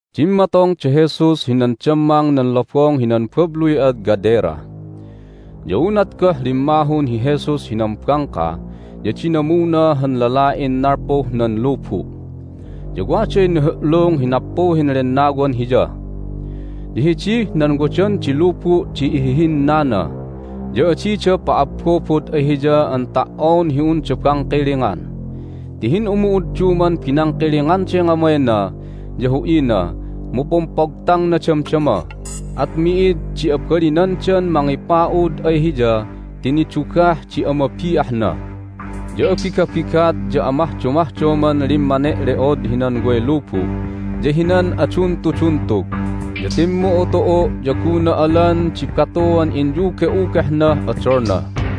Dimmatong da Jesus hinan dammang nan lobong hinan babluy ad Gadera. Ya unat goh limmahun hi Jesus hinan bangka ya dinamuna han lala'in nalpuh nan lubu'. Ya waday nihu'lung hi nappuhin lennawan hiya, ya hidih nan wadan di lubu' di ihihinnana, ya adida pa'abbobod ay hiya an ta"on hi unda bangkilingan. Ti hin'umu'udduman binangkilinganday ngamayna ya hu'ina, mu pumpogtangna damdama, at mi'id di abalinandan mangipa'ud ay hiya ti nidugah di amabi'ahna. Ya abigabigat ya amahdomahdoman limmane'le'od hinan way lubu' ya hinan aduntuduntug, ya timmu'utu'u', ya gunna alan di batuan inyuge'ugehnah odolna.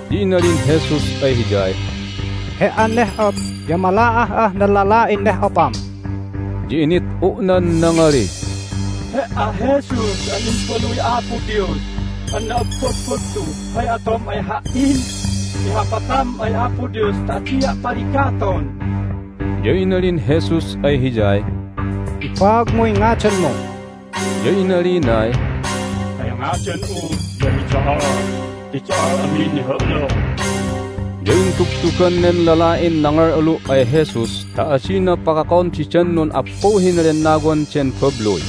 Ya inalin Jesus ay hiyay, "He"an neh'op ya mala'ah'ah nan lala'in neh'opam!" Ya init'u'nan nangalih, "He"a, Jesus an Imbaluy Apo Dios an na'abbagbagtu, hay atom ay ha"in? Ihapatam ay Apo Dios ta adia' paligaton!" Ya inalin Jesus ay hiyay, "Ibaagmuy ngadanmu." Ya inalinay, "Hay ngadan'u ya hi Do'ol ti do'ol amin nihu'lung!" Ya intugtugan nen lala'in nangal'alu' ay Jesus ta adina pakakon didan nun'appuhin lennawan den babluy.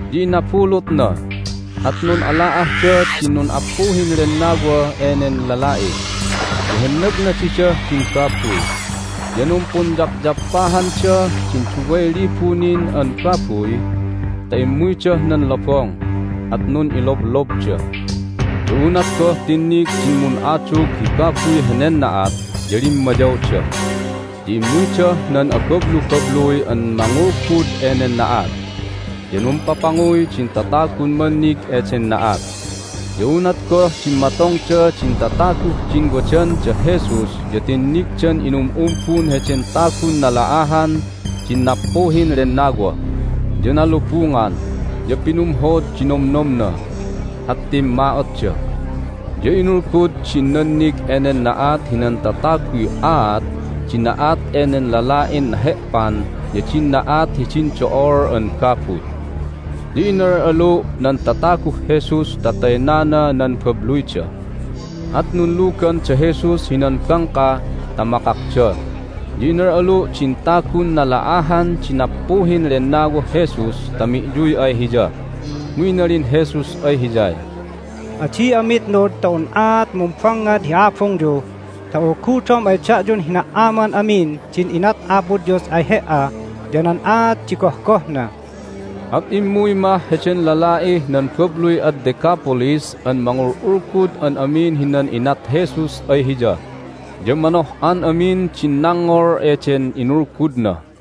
Ya inabulutna, at nun'ala'ahda din nun'appuhin lennawa enen lala'i, ya hennagna didah din babuy. Ya numpunyapyappahanda din duway libu nin an babuy ta immuydah nan lobong, at nun'iloblobda. Ya unat goh tinnig din mun'adug hi babuy henen na'at ya limmayawda, ya immuydah nan abablubabluy an mangulgud enen na'at. Ya numpapanguy din tatagun mannig eden na'at. Ya unat goh dimmatongda din tataguh din wadan da Jesus ya tinnigdan inum'umbun heden tagun nala'ahan din nappuhin lennawa, ya nalubungan, ya pinumhod di nomnomna. At timma'otda. Ya inulgud din nannig enen na'at hinan tataguy aat di na'at enen lala'in nahe'pan ya din na'at hidin do'ol an babuy. Ya inal'alu' nan tataguh Jesus ta taynana nan babluyda. At nunlugan da Jesus hinan bangka ta makakda, ya inal'alu' din tagun nala'ahan di nappuhin lennawah Jesus ta mi'yuy ay Hiya. Mu inalin Jesus ay hiyay, "Adi'a mitnud ta un'aat mumbangngad hi abungyu ta ulgudom ay da'yun hina"aman amin din inat Apo Dios ay he"a ya nan aat di gohgohna." At immuy mah heden lala'ih nan babluy ad Decapolis an mangul'ulgud an amin hinan inat Jesus ay hiya, ya manoh'an amin din nangngol eden inulgudna.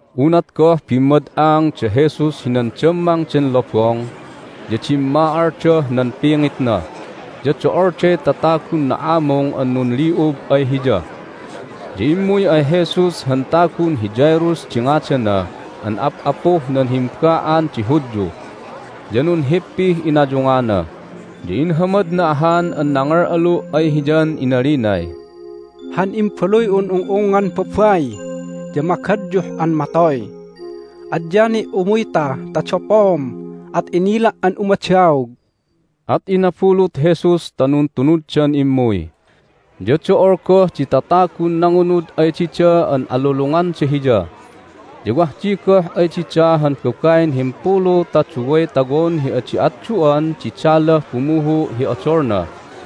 Unat goh bimmad'ang da Jesus hinan dammang den lobong ya dimma'aldah nan pingitna, ya do'olday tatagun na'amung an nunli'ub ay Hiya. Ya immuy ay Jesus han tagun hi Jairus di ngadana an ap'apuh nan himba'an di Hudyu. Ya nunhippih inayungana, ya inhamadna ahan an nangal'alu' ay Hiyan inalinay, "Han imbaluy'un ung'ungngan babai ya magadyuh an matoy! Adya ni' umuyta ta dapoom at inila' an umadaog!" At inabulut Jesus ta nuntunuddan immuy. Ya do'ol goh di tatagun nangunud ay dida an alulunganda Hiya. Ya wah di goh ay dida han babain himpulu ta duway tawon hi adi atdu'an di dalah bumuhu' hi odolna.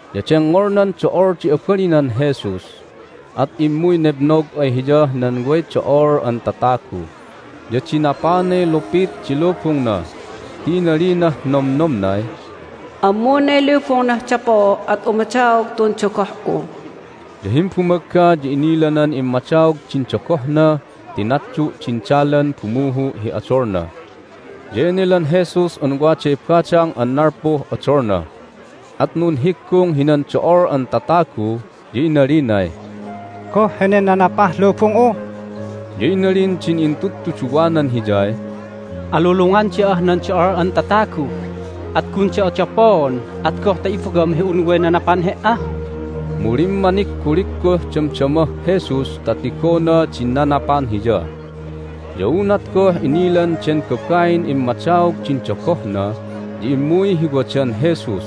Ya dengngolnan do'ol di abalinan Jesus, at immuy nebnog ay Hiyah nan way do'ol an tatagu, ya dinapanay lupit di lubungna ti inalinah nomnomnay, "Ammunay lubungnah dapoo', at umadaog tun dogoh'u." Ya himbumagga ya inilanan immadaog din dogohna ti natdu' din dalan bumuhu' hi odolna. Ya enelan Jesus an waday badang an nalpuh odolna, at nunhiggung hinan do'ol an tatagu, ya inalinay, "Goh henen nanapah lubung'u?" Ya inalin din intudtuduwanan Hiyay, "Alulungan da'ah nan do'ol an tatagu, at gun da'a dapoon, at goh ta ibagam hi un way nanapan He"a?" Mu limmanigguligguh damdamah Jesus ta tigona din nanapan Hiya. Ya unat goh inilan den babain immadaog din dogohna ya immuy hi wadan Jesus,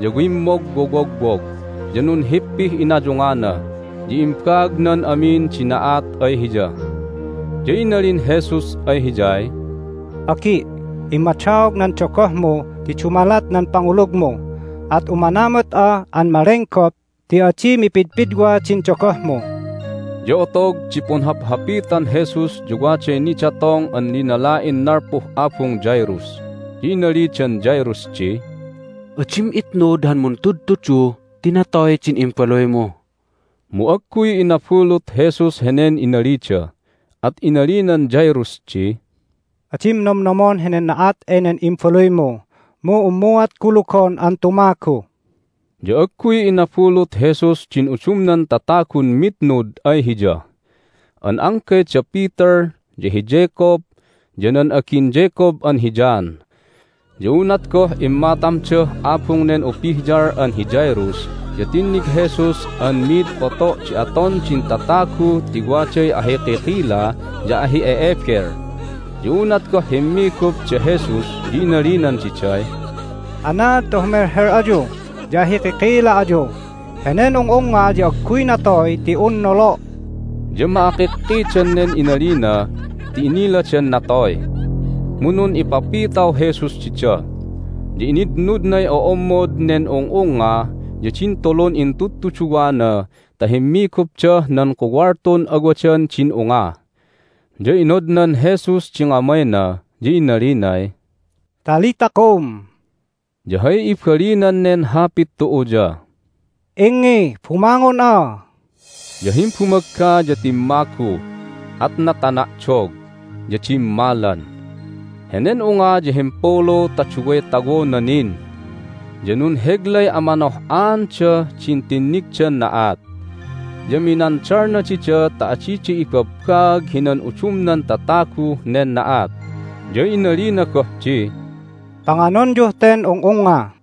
ya wimmogwowogwog, ya nunhippih inayungana, ya imbaagnan amin di na'at ay hiya. Ya inalin Jesus ay hiyay, "Agi', immadaog nan dogohmu ti dumalat nan pangulugmu! At umanamut'a an malenggop ti adi mipidpidwa din dogohmu." Ya otog di punhaphapitan Jesus ya waday nidatong an linala'in nalpuh abung Jairus. Ya inalidan Jairus di, "Adim itnud han Muntudtudu ti natoy din imbaluymu." Mu agguy inabulut Jesus henen inalida, at inalinan Jairus di, "Adim nomnomon henen na'at enen imbaluymu, mu unmuat kulugon an tumagu." Ya agguy inabulut Jesus din udumnan tatagun mitnud ay Hiya, an anggay da Peter, ya hi Jacob, ya nan agin Jacob an hi John. Ya unat goh immatamdah abung nen upihyal an hi Jairus ya tinnig Jesus an mid poto' di aton din tatagu ti waday ahikikila ya ahi'e'ebel. Ya unat goh himmigup da Jesus ya inalinan diday, "Anaad ta humelhel ayu ya ahikikila ayu? Henen ung'ungnga ya agguy natoy ti un nolo'!" Ya ma'akikkidan nen inalina ti iniladan natoy. Mu nun'ipapitaw Jesus dida, ya initnudnay o'ommod nen ung'ungnga ya din tulun intudtuduwana ta himmigupdah nan kuwaltun awadan din unga. Ya inodnan Jesus di ngamayna, ya inalinay, "Talitha koum!" (ya hay ibalinan neh hapit tu'u ya, "Ingngi, bumangon'a!") Ya himbumagga ya timmagu, at natana'dog, ya dimmalan. Henen unga ya himpulu ta duway tawona nin. Ya nunheglay amanoh'aandah din tinnigdan na'at. Ya minandalna dida ta adida ibabbaag hinan udumnan tataguh nen na'at, ya inalina goh di, "Panganonyuh ten ung'ungnga."